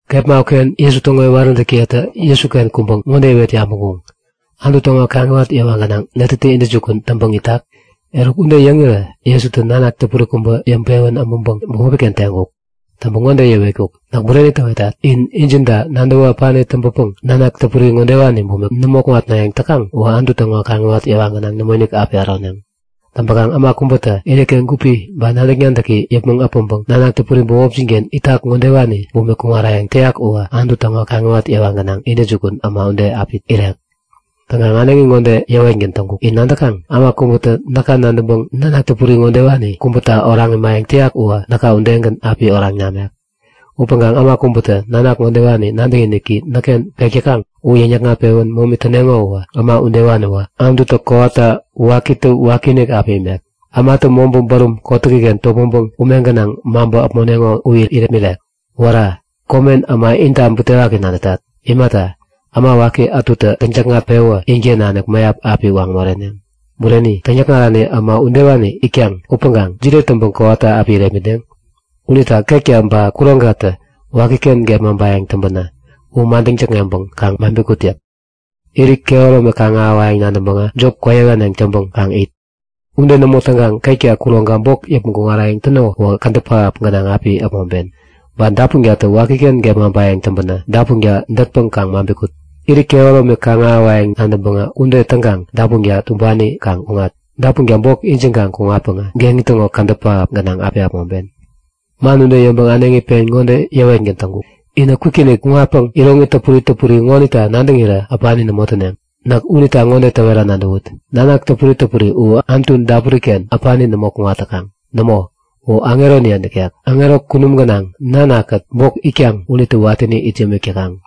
Kepma uken Jesu täŋo iwaräntäkiyetä Jesuken kuŋpäŋ ŋode iwet yabäŋkuŋ; Anutu täŋo kaŋiwat yewa gänaŋ netätä intäjukun täŋpäŋ itak? Eruk ude yäŋirä Jesutä nanak täpuri kubä yäŋpewän äbänpäŋ bämopi-ken teŋkuk. Teŋpäŋ ŋode yäwetkuk; Näk bureni täwetat. In injinta nadäwä äpani täŋpäpäŋ nanak täpuri ŋodewani bumik nämo kuŋatnayäŋ täkaŋ uwä Anutu täŋo kaŋiwat yewa gänaŋ nämoinik api äroneŋ. Täŋpäkaŋ äma kubätä iniken gupi ba nadäk-nadäki yäpmäŋ äpäŋpäŋ nanak täpuri bämopjin-ken itak ŋodewani bumik kuŋarayäŋ täyak uwä Anutu täŋo kaŋiwat yewa gänaŋ intäjukun äma ude täŋpäŋ api irek. Täŋkaŋ äneŋi ŋode yäwetgän täŋkuk; In nadäkaŋ? Äma kubätä näka nadäŋpäŋ nanak täpuri ŋodewani kubäta oraŋ imayäŋ täyak uwä näka udegän api oraŋ namek. Upäŋkaŋ äma kubätä nanak ŋodewani nadäkiniki näkken pek täkaŋ u yäŋ-yäkŋat-pewän momi täneŋo uwä äma udewaniwä Anututä kowata wakitä wakiinik api imek, ämatä mobä bärum kotäkiken topmäŋpäŋ ume gänaŋ maŋpä äpmoneŋo u irepmirek. Wära! Komen äma inta butewaki nadätat. Imata, äma waki ätutä täŋ-täkŋat-pewä inken nanik mäyap api waŋ moreneŋ. Bureni, täŋyäkŋarani äma udewani itkaŋ, upäŋkaŋ jide täŋpäŋ kowata api irepmitneŋ? Unita ketka ba kuroŋkatä wakiken gepmaŋpayäŋ täŋpänä u madäŋ täkŋeŋpäŋ kaŋ maŋpi kut yäk. Irit kehäromi kaŋ-ahäwayäŋ nadäŋpäŋä jop kwäyähäneŋ täŋpäŋ kaŋ it. Ude nämo täŋkaŋ ketka kuroŋka bok yäpmäŋ kuŋarayäŋ täno uwä kädäp pähap gänaŋ api äpmoŋpen! Ba dapunkatä wakiken gepmaŋpayäŋ täŋpänä dapunka dätpäŋ kaŋ maŋpi kut. Irit kehäromi kaŋ-ahäwayäŋ nadäŋpäŋä ude täŋkaŋ dapunka tumbani kaŋ kuŋat. Dapunka bok ijiŋkaŋ kuŋatpäŋä geŋi täŋo kädäp pähap gänaŋ api äpmoŋpen. Man ude yäŋpäŋ äneŋi pen ŋode yäwetgän täŋkuk; Inä kwikinik kuŋatpäŋ iroŋi täpuri täpuri ŋonita nadäŋirä äpani nämo täneŋ. Näk unita ŋode täwera nadäwut; Nanak täpuri täpuri u Anutu dapuri-ken äpani nämo kuŋat täkaŋ. Nämo, u aŋeroniye nikek. Aŋero kunum gänaŋ Nana-kät bok itkaŋ unitä watäni it yämik täkaŋ.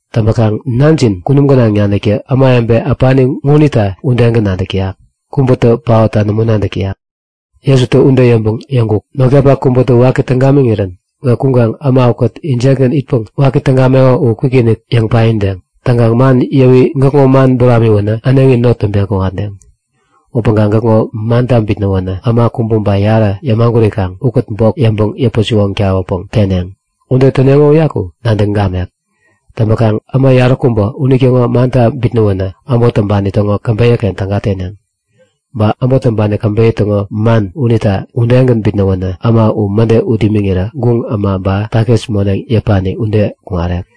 Täŋpäkaŋ Nanjin kunum gänaŋ naniktä ämawebe äpani ukeŋonita udegän nadäk täyak. Kubätä paotta nämo nadäk täyak. Jesutä ude yäŋpäŋ yäŋkuk; Notkapak kubätä waki täŋ gamiŋirän gäk kuŋkaŋ äma ukät injekgän itpäŋ waki täŋ gameko u kwikinik yäŋ paideŋ. Täŋkaŋ man yäwi gäkŋo man buramiwänä äneŋi not täŋpeŋ kuŋatdeŋ. Upäŋkaŋ gäkŋo manta bitnäwänä äma kubä ba yarä yämagurikaŋ ukät bok yäŋpäŋ yäpä-siwoŋ tawäpäŋ teneŋ. Ude täneŋo uyaku nadäŋ gamek. Täŋpäkaŋ äma yaräkubä intäŋo manta bitnäwänä äbot täŋpani täŋo käbeyä-ken täga teneŋ. Ba äbot täŋpani käbeyä täŋo man unita udegän bitnäwänä äma u mäde ut imiŋirä guŋ äma, ba takis moneŋ yäpani ude kuŋarek.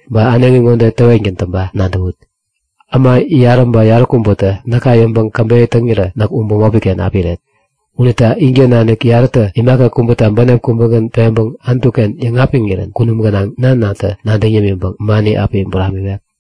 Ba äneŋi ŋode täwetgän täŋpa nadäwut; Äma yarä ba yaräkubätä näka yäŋpäŋ käbeyä täŋirä näk u bämopi-ken api iret. Unita inken nanik yarätä imaka kubäta bänep kubägän peŋpäŋ Anutu-ken yäŋapiŋirän kunum gänaŋ Nanatä nadäŋ yämiŋpäŋ mani api buramiwek.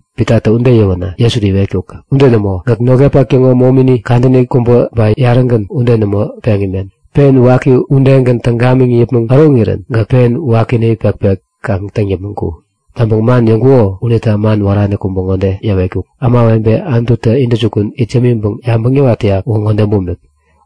Pitatä ude yäwänä Jesutä iwetkuk; Ude nämo. Gäk notkapak täŋo momini kadäni kubä ba yarätagän ude nämo peŋ imen. Pen waki udegän täŋ gamiŋ yäpmäŋ äroŋirän gäk pen wakini pekpek kaŋ täŋ yäpmäŋ ku. Täŋpäŋ man yäŋkuko unita man wärani kubä ŋode yäwetkuk; Ämawebe Anututä intäjukun it yämiŋpäŋ yabäŋ yäwat täyak uwä ŋode bumik;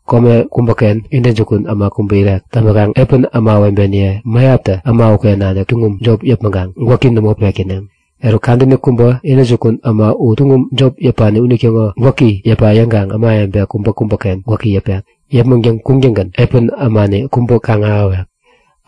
Kome kubäken intäjukun äma kubä irek. Täŋpäkaŋ epän ämawebeniye mäyaptä äma uken nanik tuŋum jop yäpmäŋkaŋ gwäki nämo pek täneŋ. Eruk kadäni kubä intäjukun äma u tuŋum jop yäpani unitäŋo gwäki yäpa yäŋkaŋ ämawebe kubäkubäken gwäki yäpek. Yäpmäŋtäŋ kuŋtäŋgän epän ämani kubä kaŋ-ahäwek.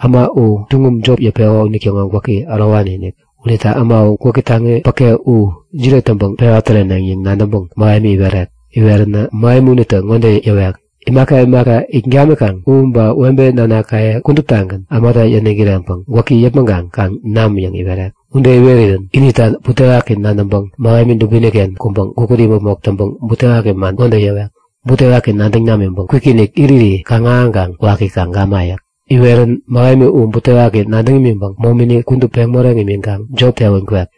Äma u tuŋum jop yäpeko unitäŋo gwäki ärowani-inik. Unita äma u gwäki taŋi päke u jide täŋpäŋ pewa täreneŋ yäŋ nadäŋpäŋ mähemi iwerek. Iwerirän mähemi unitä ŋode yäwek; Imaka imaka it gamikaŋ u ba webe nanakaye kuduptagän ämata yäniŋ kireŋpäŋ gwäki yäpmäŋkaŋ kaŋ nam yäŋ iwerek. Ude iwerirän inita butewaki nadäŋpäŋ mähemi dubini-ken kuŋpäŋ gukut imäpmok täŋpäŋ butewaki man ŋode yäwek; Butewaki nadäŋ namiŋpäŋ kwikinik iriri kaŋ-ahäŋkaŋ waki kaŋ gama yäk. Iwerirän mähemi u butewaki nadäŋ imiŋpäŋ momini kudup peŋ moreŋ imiŋkaŋ jop tewän kwek.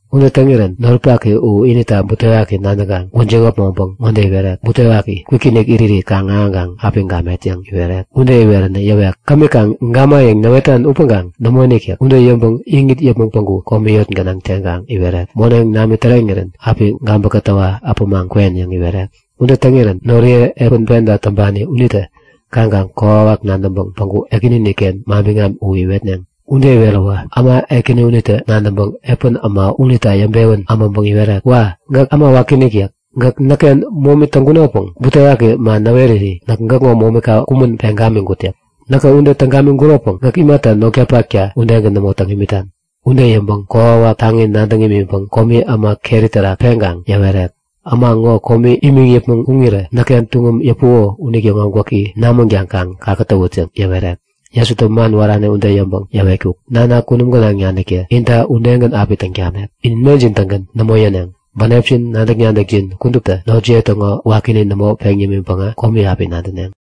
Ude täŋirän noripak u inita butewaki nadäŋkaŋ gwäjiŋ äpmoŋpäŋ ŋode iwerek; Butewaki! Kwikinik iriri kaŋ-ahäŋkaŋ api gamet yäŋ iwerek. Ude iweränä yäwek; Kämi kaŋ gamayäŋ näwetan upäŋkaŋ nämoinik yäk. Ude yäŋpäŋ iŋit yäpmäŋ päŋku komi yot gänaŋ teŋkaŋ iwerek; Moneŋ nami täreŋirän api gabä kätäwä äpämaŋ kwen yäŋ iwerek. Ude täŋirän noriye epän penta täŋpani unitä kaŋkaŋ kokwawak nadäŋpäŋ päŋku ekänini-ken manbiŋam u iwetneŋ. Ude iweräwä äma ekäni unitä nadäŋpäŋ epän äma unita yäŋpewän äbänpäŋ iwerek; Wa! Gäk äma wakiinik yäk. Gäk näkken momi täŋkunopäŋ butewaki man näweriri näk gäkŋo momika kumän peŋ gamiŋkut yäk. Näkä ude täŋ gamiŋkuropäŋ gäk imata notkapakta udegän nämo täŋ imitan? Ude yäŋpäŋ kokwawak taŋi nadäŋ imiŋpäŋ komi äma keri terak peŋkaŋ yäwerek; Äma ŋo komi imiŋ yäpmäŋ kuŋirä näkken tuŋum yäpuko unitäŋo gwäki namänkaŋ kaŋ kakätäwut yäŋ yäwerek. Jesutä man wärani ude yäŋpäŋ yäwetkuk; Nana kunum gänaŋ naniktä inta udegän api täŋ tamek. In mejin-tägän nämo yäneŋ. Bänepjin nadäk-nadäkjin kuduptä notjiye täŋo wakini nämo peŋ yämiŋpäŋä komi api nadäneŋ.